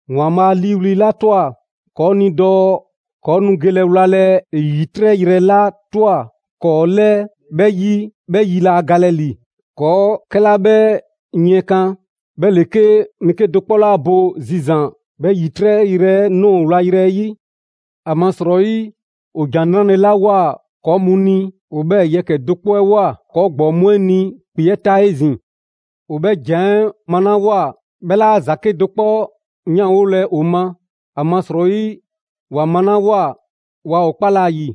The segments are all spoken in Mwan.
‑Waanbhaa' 'a 'liiwli‑ 'la ꞊twa ‑kɔɔ' ni dɔɔ ‑kɔɔ' nu gelɛ wlalɛ ‑e ‑yitrɛ' yrɛ 'la ꞊twa ‑kɔɔ' 'lɛɛ 'bhɛ 'yi 'bhɛ 'yi 'laa galɛ ‑li. ‑Kɔɔ' 'kɛla 'bhɛ 'yiɛnkan 'bhɛ ‑le 'ke mɛɛ 'kedo‑ 'kpɔ 'laa bo zizan‑ 'bhɛ ‑yitrɛ' yrɛ 'ɛ ꞊nɔɔ wlale 'ɛ 'yi. ‑Amasrɔyi ‑o ‑Jan 'Nrale‑ 'la ꞊woa ‑kɔɔ' mu ni, ‑o 'bhɛɛ‑ yɛkɛ‑ do 'kpɔ 'ɛ ꞊woa ‑kɔɔ ‑gbɔɔ mu 'ɛ ni ‑kpe 'ɛ ta 'ezin‑. ‑O 'bhɛ ‑jan 'ɛ 'malawoa, 'bhɛ 'laa ‑za 'kedo‑ 'kpɔ 'yanwolɛ ‑o ma, ‑amasrɔyi ‑wa malawoa waa ‑o 'kpalɛ‑ ‑a ‑yi.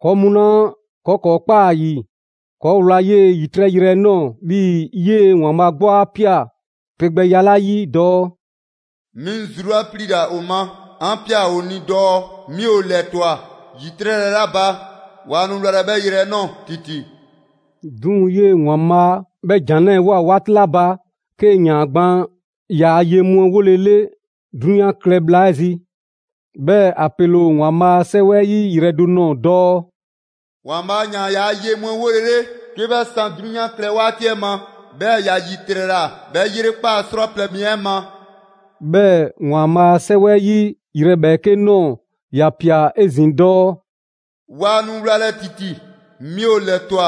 ‑Kɔɔ' mu 'la ‑kɔɔ' ‑kɔɔ' 'kpaa‑ ‑a ‑yi, ‑kɔɔ' ꞊wlaa 'yee‑ ‑yitrɛ' yrɛ 'ɛ ꞊nɔɔ 'bhii‑ 'yee‑ ‑Waanbhaa' 'gbu 'a ꞊pia pe gbɛya 'la 'yi dɔɔ: «'Mi 'ŋ zru 'la 'pliila‑ ‑o ma, 'an ꞊pia ‑o ni dɔɔ 'mi ‑o ‑lɛtwa ‑yitrɛ' yrɛ 'la ba, waa nu wlalɛ 'bhɛ yrɛ 'ɛ ꞊nɔɔ ‑titi!» 'Duŋ‑ 'yee‑ ‑Waanbhaa' 'bhɛ ‑jan 'lɛɛ‑ ꞊woa 'waati 'la ba 'kee‑ ‑yaan gban ‑yaa' ye mu 'ɛ 'wolele 'drunyan klɛ bhla 'ɛ zi. 'Bhɛɛ‑ ‑a pele ‑o ‑Waanbhaa' a 'Sɛwɛ 'ɛ 'yi yrɛ do nɔɔ‑ dɔɔ: «‑Waanbhaa' ‑yaan ‑yaa' ye mu 'ɛ 'wolele 'ke 'bhɛ 'san 'drunyan 'ɛ klɛ 'waati 'ɛ ma, 'bhɛɛ‑ ‑ya ‑yitrɛla 'bhɛ ‑yrekpaa' 'srwaplɛ‑ mi 'ɛ ma.» 'Bhɛɛ‑ ‑Waanbhaa' a 'Sɛwɛ 'yi yrɛ ‑bhɛɛke' ꞊nɔɔ, ‑ya ꞊pia 'ezin‑ dɔɔ: «Waa nu wlalɛ ‑titi 'mi ‑o ‑lɛtwa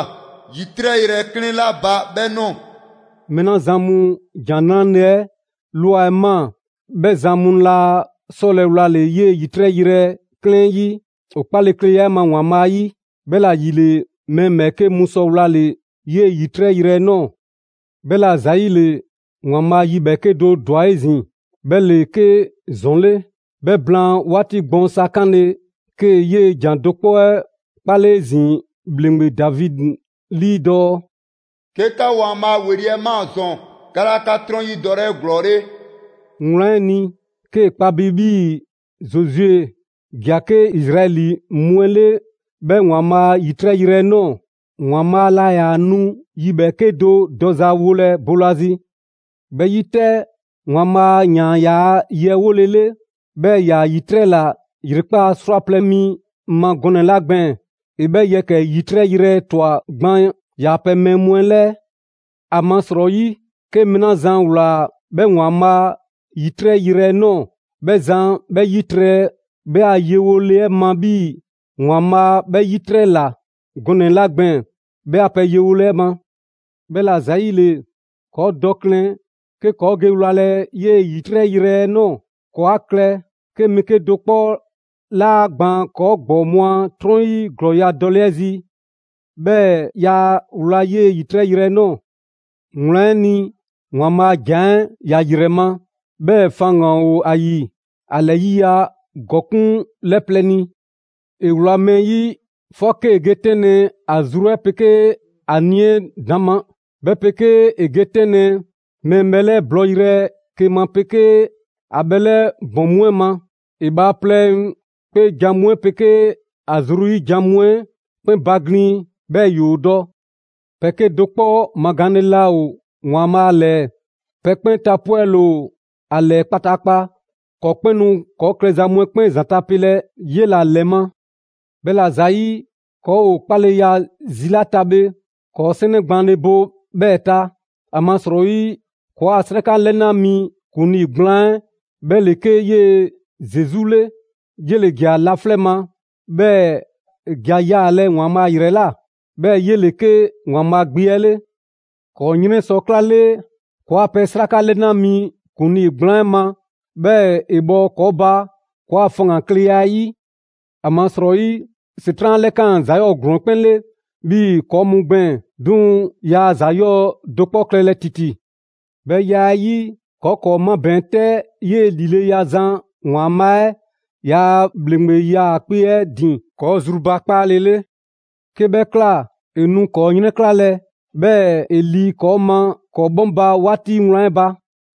‑yitrɛ' yrɛ 'klɛɛn 'la ba 'bhɛ ꞊nɔɔ.» Mɛɛ 'la zan mu ‑Jan 'Nrale‑ 'ɛ ꞊lwa ꞊maa, 'bhɛ zan mu laa 'sɔlɛ‑ wlale‑ 'yee‑ ‑yitrɛ' yrɛ 'klɛɛn 'ɛ 'yi ‑o 'kpakleya 'ɛ ma ‑Waanbhaa' ‑yi; 'bhɛla‑ ‑yile, mɛɛ ‑bhɛɛke' mu sɔ wlale‑ 'yee‑ ‑yitrɛ' yrɛ 'ɛ ꞊nɔɔ. 'Bhɛla‑ ‑zayile, ‑Waanbhaa' yi ‑bhɛɛke' do ‑dwa 'ezin‑; 'bhɛ ‑le 'ke «‑Zɔn 'le». 'Bhɛ blaan 'waati gbɔɔn sa 'kanle‑, 'kee‑ 'yee‑ ‑jan do 'kpɔ 'ɛ 'kpale 'ezin‑ ‑bhleŋgbe Davidi 'lii dɔɔ: «'Ke 'ka ‑Waanbhaa' ‑weli' 'ɛ ꞊maa ‑zɔn, 'ka 'laa 'ka 'trɔn 'yi dɔlɛ 'eglɔɔle.» Wlan 'ɛ ni, 'kee‑ kpa bi 'bhii‑ Zozue ‑ja 'ke Izraɛli mu 'ɛ 'le 'bhɛ ‑Waanbhaa' a ‑yitrɛ' yrɛ 'ɛ ꞊nɔɔ, ‑Waanbhaa' laa ‑yaa nu yi ‑bhɛɛke' do dɔza wolɛ boolazi. 'Bhɛ 'yi 'tɛ, ‑Waanbhaa' ‑yaan ‑yaa' ye 'ɛ 'wolele, 'bhɛɛ‑ ‑ya ‑yitrɛla ‑yrekpaa' 'srwaplɛ‑ mi ma gɔnɛ‑ 'la gbɛɛn‑, ‑e 'bhɛɛ‑ yɛkɛ‑ ‑yitrɛ' yrɛ ꞊twa gban ‑yaa' pɛ mɛɛ mu 'ɛ 'lɛɛ. ‑Amasrɔyi, 'ke mɛɛ 'la zan ‑wlaa 'bhɛ ‑Waanbhaa' ‑yitrɛ' yrɛ 'ɛ ꞊nɔɔ, 'bhɛ zan 'bhɛ 'yitrɛ 'bhɛ a yewole 'ɛ ma 'bhii‑ ‑Waanbhaa' 'bhɛ 'yitrɛla gɔnɛ‑ 'la gbɛɛn‑ 'bhɛ a pɛ yewole 'ɛ ma. 'Bhɛla‑ ‑zayile, ‑kɔɔ' dɔ klɛn 'ke ‑kɔɔ' ge wlalɛ 'yee‑ ‑yitrɛ' yrɛ 'ɛ ꞊nɔɔ; ‑kɔɔ' 'a klɛ 'ke mɛɛ 'kedo‑ 'kpɔ 'laa gbaan ‑kɔɔ' ‑gbɔɔ mu a 'trɔn 'yi ‑glɔɔya' dɔle 'ɛ zi, 'bhɛɛ‑ yaa wla 'yee‑ ‑yitrɛ' yrɛ 'ɛ ꞊nɔɔ. Wlan 'ɛ ni, ‑Waanbhaa' a ‑jan 'ɛ ‑ya ‑yrɛ ma, 'bhɛɛ‑ faŋgan‑ ‑o ‑a ‑yi. ‑A ‑lɛ ‑yiya' ‑gɔkuŋ' 'lɛ plɛ ni. ‑E wla mɛɛ ‑yi 'fɔ 'kee‑ ge 'tɛnlɛ‑ ‑a zru 'ɛ 'pegee ‑a nii‑ 'ɛ ‑daŋ' ma; 'bhɛ 'pegee ‑e ge 'tɛnlɛ‑ mɛɛ bhɛlɛ' bɔyrɛ 'ke ma 'pegee ‑a bhɛlɛ' ‑bɔn mu 'ɛ ma. ‑E bhaaplɛŋ 'kpeejan‑ mu 'ɛ 'pegee ‑a zru ‑yi jan mu 'ɛ 'kpɛn baglin‑ 'bhɛɛ‑ ‑yoo dɔ. Pɛ 'kedo‑ 'kpɔ magaanle laa ‑o ‑Waanbhaa' 'lɛɛ. Pɛ 'kpɛn tapwɛle ‑o ‑a 'lɛɛ kpataakpa. ‑Kɔɔ' 'kpɛn nu ‑kɔɔ' klɛza mu 'ɛ 'kpɛn ‑zanta' pelɛ 'yela‑ ‑lɛ ma. 'Bhɛla‑ ‑zayi', ‑kɔɔ' ‑o 'kpaleya zi 'la ta bhe, ‑kɔɔ' 'sɛnɛ gbaanle bo 'bhɛɛ‑ ta. ‑Amasrɔyi ‑kɔɔa' 'sraka 'lɛna 'mi ‑kuŋlii gblaan 'ɛ 'bhɛ ‑le 'ke 'yee‑ Zesu 'le. 'Yele‑ ‑ja laflɛ' ma, 'bhɛɛ‑ ‑e ‑ja yaalɛ ‑Waanbhaa' ‑yrɛ ꞊la, 'bhɛɛ‑ 'yele‑ 'ke ‑Waanbhaa' Gbe 'ɛ 'le. ‑Kɔɔ' 'yrɛn sɔ 'klale ‑kɔɔa' pɛ 'sraka 'lɛna mi ‑kuŋlii gblaan 'ɛ ma, 'bhɛɛ‑ ‑e bhɔ ‑kɔɔ' ba ‑kɔɔa' faŋgankleya 'ɛ 'yi. ‑Amasrɔyi ‑Setran' 'a 'lɛkaan‑ ‑za 'yɔɔ‑ ‑glɔɔn 'ɛ 'kpɛn 'le, 'bhii‑ ‑kɔɔ' mu gbɛɛn‑, 'duŋ‑ yaa ‑za 'yɔɔ‑ do 'kpɔ klɛlɛ ‑titi. 'Bhɛ ya 'ɛ 'yi, ‑kɔɔ' ‑kɔɔ' 'mabɛɛn‑ 'tɛ 'yee‑ ‑lileya zan ‑Waanbhaa' 'ɛ ‑yaa' ‑bhleŋgbe 'yaakpe‑ 'ɛ ‑din ‑kɔɔ' zrubakpaale 'le. 'Ke 'bhɛ ꞊kla, ‑e nu ‑kɔɔ' 'yrɛnklalɛ, 'bhɛɛ‑ ‑e ‑li ‑kɔɔ' ma ‑kɔɔ' 'bhɔŋba‑ 'waati wlan 'ɛ ba.